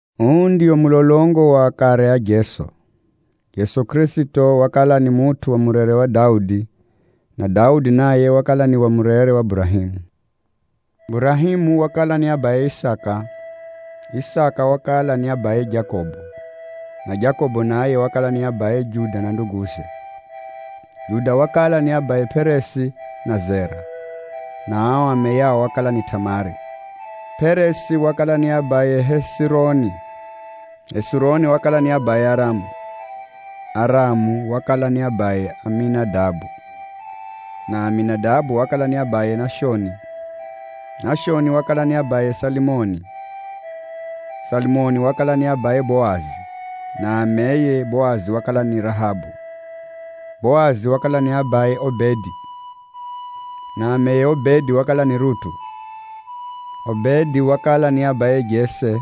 Uu ndio mulolongo wa akare a Jeso. Jeso Kʼirisito wakala ni mutʼu wa mudzungu wa Daudi, na Daudi naye wakala ni wa mudzungu wa Burahemu. Burahemu wakala ni abaye Isaka, Isaka wakala ni abaye Jakobo, na Jakobo naye wakala ni abaye Juda na nduguze. Juda wakala ni abaye Peresi na Zera, (na ao ameyao wakala ni Tamari); Peresi wakala ni abaye Hezironi, Hezironi wakala ni abaye Aramu, Aramu wakala ni abaye Aminadabu, na Aminadabu wakala ni abaye Nashoni. Nashoni wakala ni abaye Salimoni. Salimoni wakala ni abaye Boazi, (na ameye Boazi wakala ni Rahabu). Boazi wakala ni abaye Obedi, (na ameye Obedi wakala ni Rutu). Obedi wakala ni abaye Jese,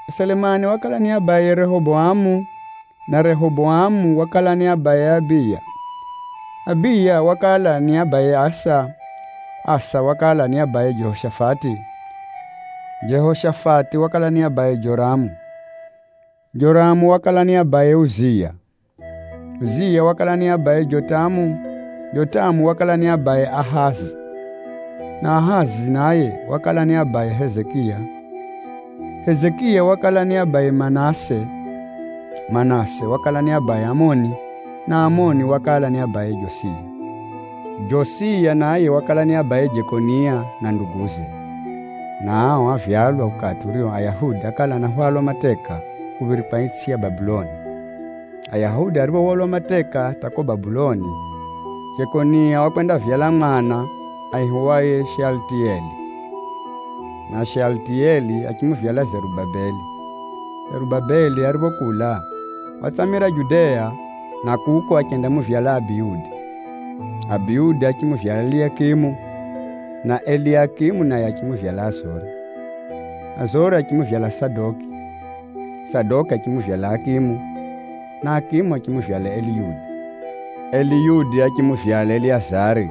Selemani wakala ni abaye Rehoboamu, na Rehoboamu wakala ni abaye Abija. Abija wakala ni abaye Asafu, Asafu wakala ni abaye Jehoshafati, Jehoshafati wakala ni abaye Joramu, Joramu wakala ni abaye Uziya, Uziya wakala ni abaye Jotamu, Jotamu wakala ni abaye Ahazi, na Ahazi naye wakala ni abaye Hezekiya. Hezekiya wakala ni abaye Manase, Manase wakala ni abaye Aamoni, na Aamoni wakala ni abaye Josiya. Josiya naye wakala ni abaye Jekonia na nduguze, na ao ávyalwa ukati urio Ayahudi ákala anahwalwa mateka kuphirikwa itsʼi ya Babeli. Ayahudi ariphohwalwa mateka hata ko Babeli, Jekonia wakwendavyala mwana aihiwaye Shealitiyeli, na Shealitiyeli achimuvyala Zerubabeli. Zerubabeli ariphokula, watsamira Judea, na kuko achendamuvyala Abihudi, Abihudi achimuvyala Eliakimu, na Eliakimu naye achimuvyala Azori. Azori achimuvyala Sadoki, Sadoki achimuvyala Akimu, na Akimu achimuvyala Eliyudi. Eliyudi achimuvyala Eleyazari,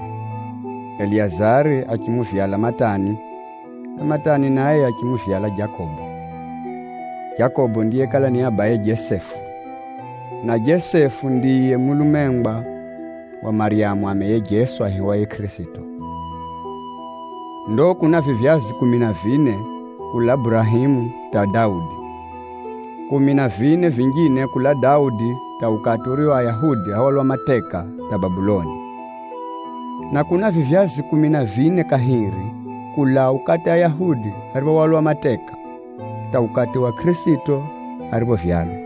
Eleyazari achimuvyala Matani, na Matani naye achimuvyala Jakobo. Jakobo ndiyekala ni abaye Jesefu, na Jesefu ndiye mulumengwa wa Maryamu ameye Jeso aihiwaye Kʼirisito. Ndo kuna vivyazi kumi na vine ulaa Burahemu hata Daudi, kumi na vine vinjine kulaa Daudi hata ukati urio Ayahudi áhwalwa mateka hata Babeli, na kuna vivyazi kumi na vine kahiri kulaa ukati Ayahudi ariphohwalwa mateka, hata ukati yiye Kʼirisito ariphovyalwa.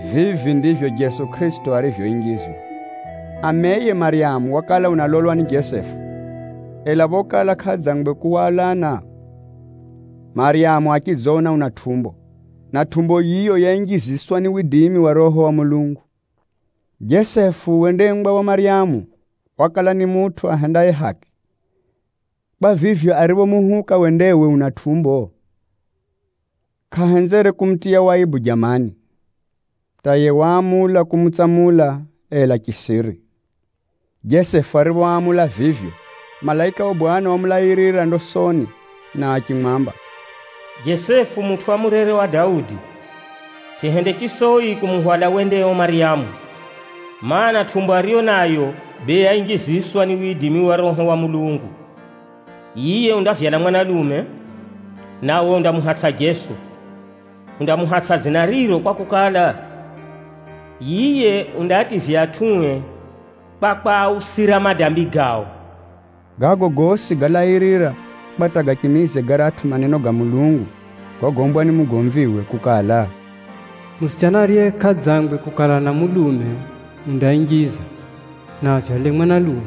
Vivi ndivyo Jeso Kʼirisito arivyoinjizwa: Ameye Maryamu wakala unalolwa ni Jesefu, ela phokala kʼaadzangwe kuhwalana, Maryamu achidziona una tʼumbo, na tʼumbo yiyo yainjiziswa ni widimi wa Roho wa Mulungu. Jesefu wendengwa wa Maryamu, wakala ni mutʼu ahendaye haki. Kwa vivyo, ariphomuuhuka wendewe una tʼumbo, kʼahenzere kumutiya waibu jamani, hata yiye waamula kumutsamula, ela chisiri. Jesefu ariphoamula vivyo, malaika wa Bwana wamulairira ndosoni na achimwamba, “Jesefu mutʼu wa mudzungu wa Daudi, tsʼihende chisoi kumuhwala wendeo Maryamu, mana, tʼumbo ariyo nayo bee yainjiziswa ni widimi wa Roho wa Mulungu. Yiye undavyala mwanalume, nawe undamuhatsʼa Jeso. Undamuhatsʼa dzina riro kwakukala, yiye undaativya atʼue kwa kwausira madambi gao.” Gago gosi gálairira kwa hata gachimize garatʼu maneno ga Bwana Mulungu gogombwa ni mugomviwe kukala, “Musichana ariye kʼadzangwe kumanya mulume undainjiza, na avyale mwanalume,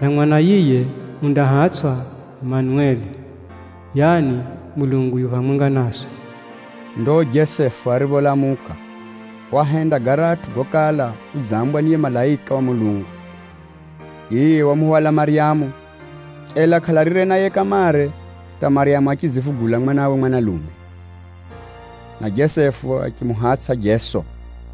na mwana yiye undahatsʼwa ‘Manueli’ (yaani, Mulungu u phamwenga naswi).” Ndo Jesefu aripholamuka, wahenda garatʼu gokala udzambwa ni yiye malaika wa Bwana. Yiye wamuhwala Maryamu, ela kʼalalire naye kamare hata Maryamu achidzivugula mwanawe mwanalume. Na Jesefu achimuhatsʼa Jeso.